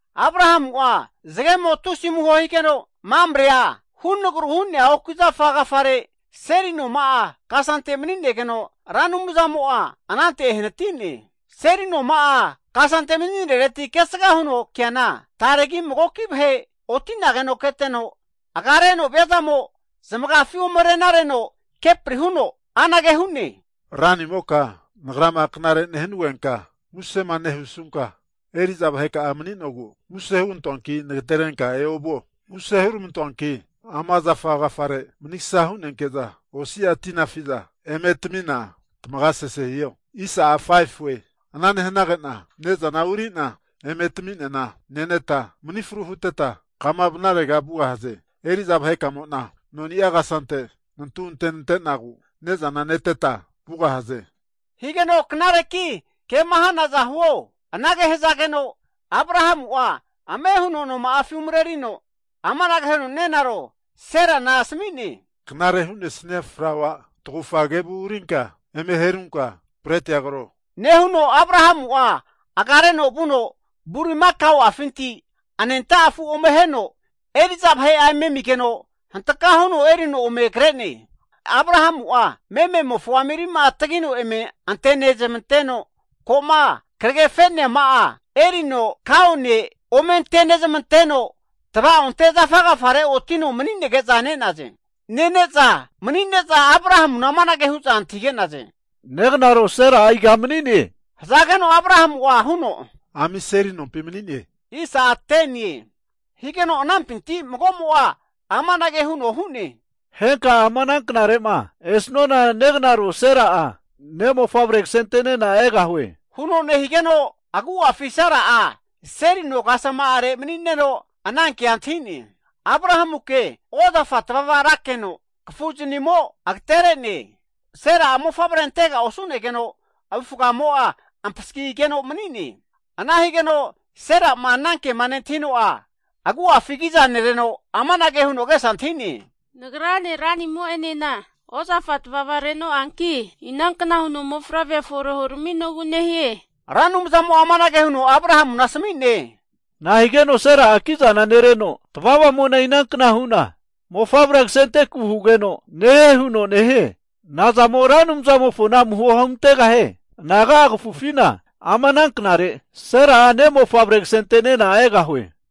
Abrahamu'a zagemo tusi amuho higeno, Mamrea hunagru hu'nea oki zafa agafare seli noma'a kasante mani'negeno, Ra Anumzamo'a anante ehanati'ne. Seli noma'a kasante mani'nereti kesga huno keana, taregi magoki vahe oti'nageno keteno, agareno viazamo zamagafi ome arena areno kepri huno, anage hu'ne, Ranimota nagrama knare nehanugeta musema nehusuta eri'za vahetami mani'nogu muse huramantoanki nagatereta eoviho! Muse huramantoanki ama zafa agafare manigsa hunenke'za osia tina afi'za eme tamina tamaga sese hiho. Ana nehanage'na ne'zana uri'na eme taminena neneta manifru huteta kama vanarega vugahaze. Eri'za vahekamo'na noni'a kasante nantu ante nante'nagu ne'zana neteta vugahaze, hige'za knareki kema hanaza huo. Anage hazageno Abrahamu'a ame huno noma'afi umarerino amanage huno nenaro Serana asamine, Knare hu'nesnia flaua tagufa kevu urinka eme herunka bretia kro, nehuno Abrahamu'a agareno vuno bulimaka'afinti anenta afu ome aheno eri'za vahe'a eme amigeno, hantka huno erino ome kre'ne. Abrahamu'a meme'mofo ami rima'a tagino eme ante nezmanteno, ko'ma kragefe'neama'a erino kaone eme ante nezamanteno tva'onte zafa agafare otino mani'nege'za ne'naze. Nene'za mani'ne'za Abrahamuna amanage hu'za antahige'naze, Negnaro Sera'a iga mani'ne? Hazageno Abrahamu'a huno, Ami seli nompi mani'ne. Higeno anampinti mago'mo'a amanage huno hu'ne, Henka'a ama ana knare'ma esnuana negnaro Sera'a ne' mofavre kasente'nena egahue. Huno nehigeno agu'afi Sera'a seli no kasama'are mani'neno ana ke antahi'ne. Abrahamuke ozafa tavava rakeno, kafu zanimo'a agaterege'ne. Sera'a mofavre antega osu'negeno avufagamo ampasagigeno mani'ne. Ana higeno Sera'ma ana kema nentahino'a agu'afi kiza nereno amanage huno agesa antahi'ne, Nagrane ranimo'enena ozafa tavava renoanki, inankna huno mofavrea fore huraminogu nehie? Ra Anumzamo'a amanage huno Abrahamuna asami'ne, Nahigeno Sera'a kizana nereno, tavavamo'na inankna huna mofavrea kasenteku hugeno nehie huno nehie? Nazamo Ra Anumzamofona amuho huntegahie? Anaga'a kafufina ama ana knare, Sera'a ne' mofavre kasente'nena egahie.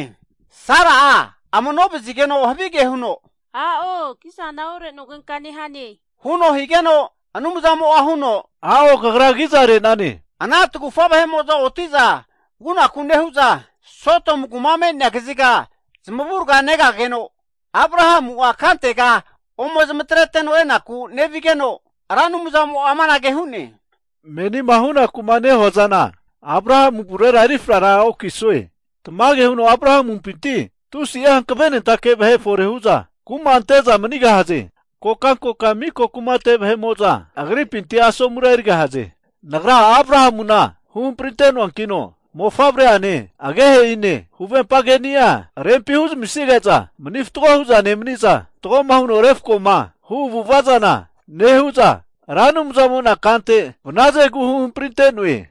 Sera'a amano vazigeno havige huno, A'o kizana ore nogenka nehane, huno higeno Anumzamo huno, A'o kagra kiza re'nane. Ana tagufa vahe'mo'za oti'za vunaku nehu'za, Sodomu kuma me'nea kaziga zamavurga negageno (Abrahamu kantega ome zamatreteno enaku nevigeno), Ra Anumzamo'a amanage hu'ne, Menima hunaku'ma nehua zana Abrahamu avurera eri frara okisue. Tamage huno Abrahamumpinti tusi'a hankavenentake vahe fore hu'za kuma ante'za manigahaze. Kokankoka mika kumate vahe'mo'za agripinti asomura erigahaze. Nagra Abrahamuna huhamprinte'noankino mofavre'ane, agehe'ine huvempa keni'a rempi huzamisige'za, mani fatgo hu'za nemaniza fatgoma huno refkoma hu avu'ava zana nehu'za Ra Anumzamo'na kante vanazegu huhamprinte'noe.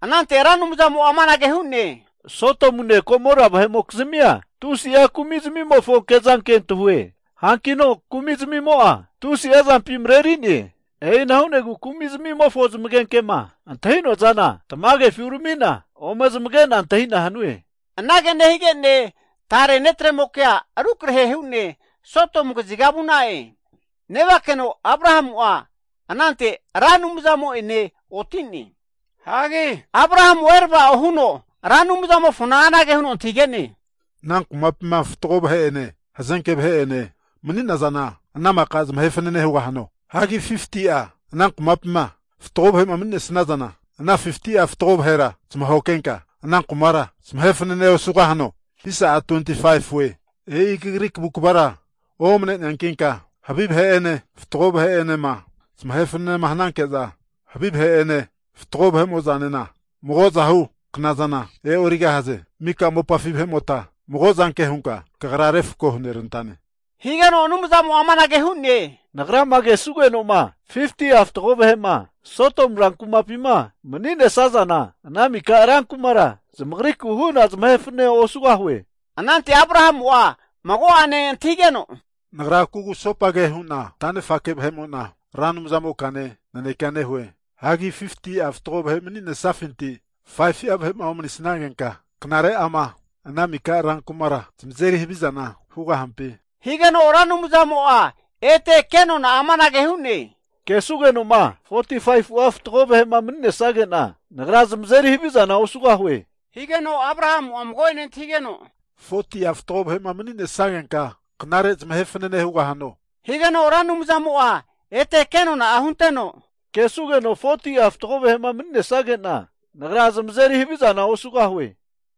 Anante Ra Anumzamo'a amanage hu'ne, Sodomune Gomora vahe'mokizmia tusi'a kumizmimofo kezanke antahue, hankino kumi'zmimo'a tusi'a zampi mareri'ne. E'ina hu'nagu kumi zmimofo zamagenkema antahi'noa zana tamagefi, urami'na ome zamage'na antahina hanue. Anage nehige'ne tare netremokea rukrahe hu'ne Sodomu kaziga vu'na'e. Nevakeno Abrahamu'a anante Ra Anumzamo'ene oti'ne. Hagi Abrahamu'a erava'o huno Ra Anumzamofona anage huno antahige'ne, Ana kumapima fatgo vahe'ene, hazenke vahe'ene mani'nazana ana maka zamahe fanane hugahano? Hagi 50'a ana kumapima fatgo vahe'ma mani'nesazana, ana 50'a fatgo vahera zamahoke henka ana kumara zamahe fanane osugahano? E'i kagri kavu kvara omane'neankinka, havi vahe'ene fatgo vahe'enema zamahe fanane hananke'za havi vahe'ene, fatgo vahe'mo'zanena mago'zahu knazana e'origahaze. Mika mopafi vahe'mota mago'zanke hunka Kagra refko hunerantane. Higeno Anumzamo'a amanage hu'ne, Nagra'ma kesugeno'ma 50'a fatgo vahe'ma Sodomu ran kumapima mani'nesazana, ana mika rankumara zamagriku hu'na zamahe fanane osugahue. Anante Abrahamu'a mago'ane antahigeno, Nagra kugusopage hu'na tanefake vahe'mo'na Ra Anumzamokane naneke nehue. Hagi 50'a fatgo vahe mani'nesafinti 5fu'a vahe'ma omanisnagenka, knare ama ana mika rankumara zamazeri havizana hugahampi? Higeno Ra Anumzamo'a ete ke nona'a amanage hu'ne, Kesugenoma 45'a fatgo vahe'ma mani'nesage'na Nagra zamazeri havizana osugahue. Higeno Abrahamu'a mago'ene antahige'no, 40'a fatgo vahe mani'nesagenka knare zamahe fanane hugahano? Higeno Ra Anumzamo'a ete ke nona'a hunteno, Kesugeno 40'a fatgo vahe'ma mani'nesage'na, Nagra zamazeri havizana osugahue.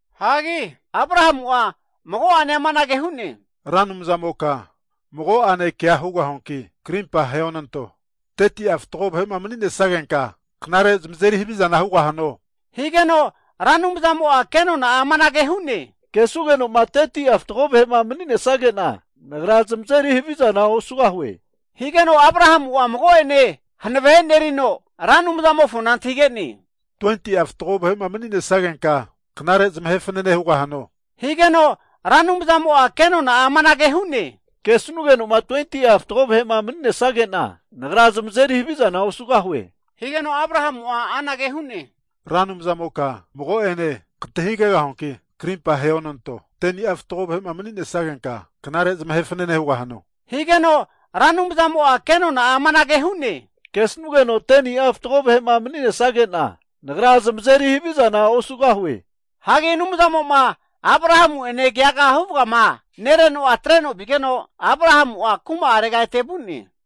Hagi Abrahamu'a mago'ane amanage hu'ne, Ra Anumzamoka mago'ane kea hugahuanki krimpa aheonanto, 30'a fatgo vahe mani'nesagenka knare zamazeri havizana hugahano? Higeno Ra Anumzamo'a ke nona'a amanage hu'ne, Kesugeno'ma 30'a fatgo vahe'ma mani'nesage'na, Nagra zamazeri havizana osugahue. Higeno Abrahamu'a mago'ene hanave e'nerino Ra Anumzamofo antahige'ne, 20'a fatgo vahe'ma mani'nesagenka knare zamahe fanane hugahano? Higeno Ra Anumzamo'a kenona'a amanage hu'ne, Kesugenoma 20'a fatgo vahe'ma mani'nesage'na Nagra zamazeri havizana osugahue. Higeno Abrahamu'a anage hu'ne, Ra Anumzamoka mago'ene kantahigegahuanki krimpa aheonanto, 10ni'a fatgo vahe'ma mani'nesagenka knare zamahe fanane hugahano? Higeno Ra Anumzamo'a ke nona'a amanage hu'ne, Kesanugenoma 10ni'a fatgo vahe'ma mani'nesage'na Nagra zamazeri havizana osugahue. Hagi Anumzamo'ma Abrahamu'ene keaga huvagama nereno'a atreno vigeno, Abrahamu'a kuma'arega ete vu'ne.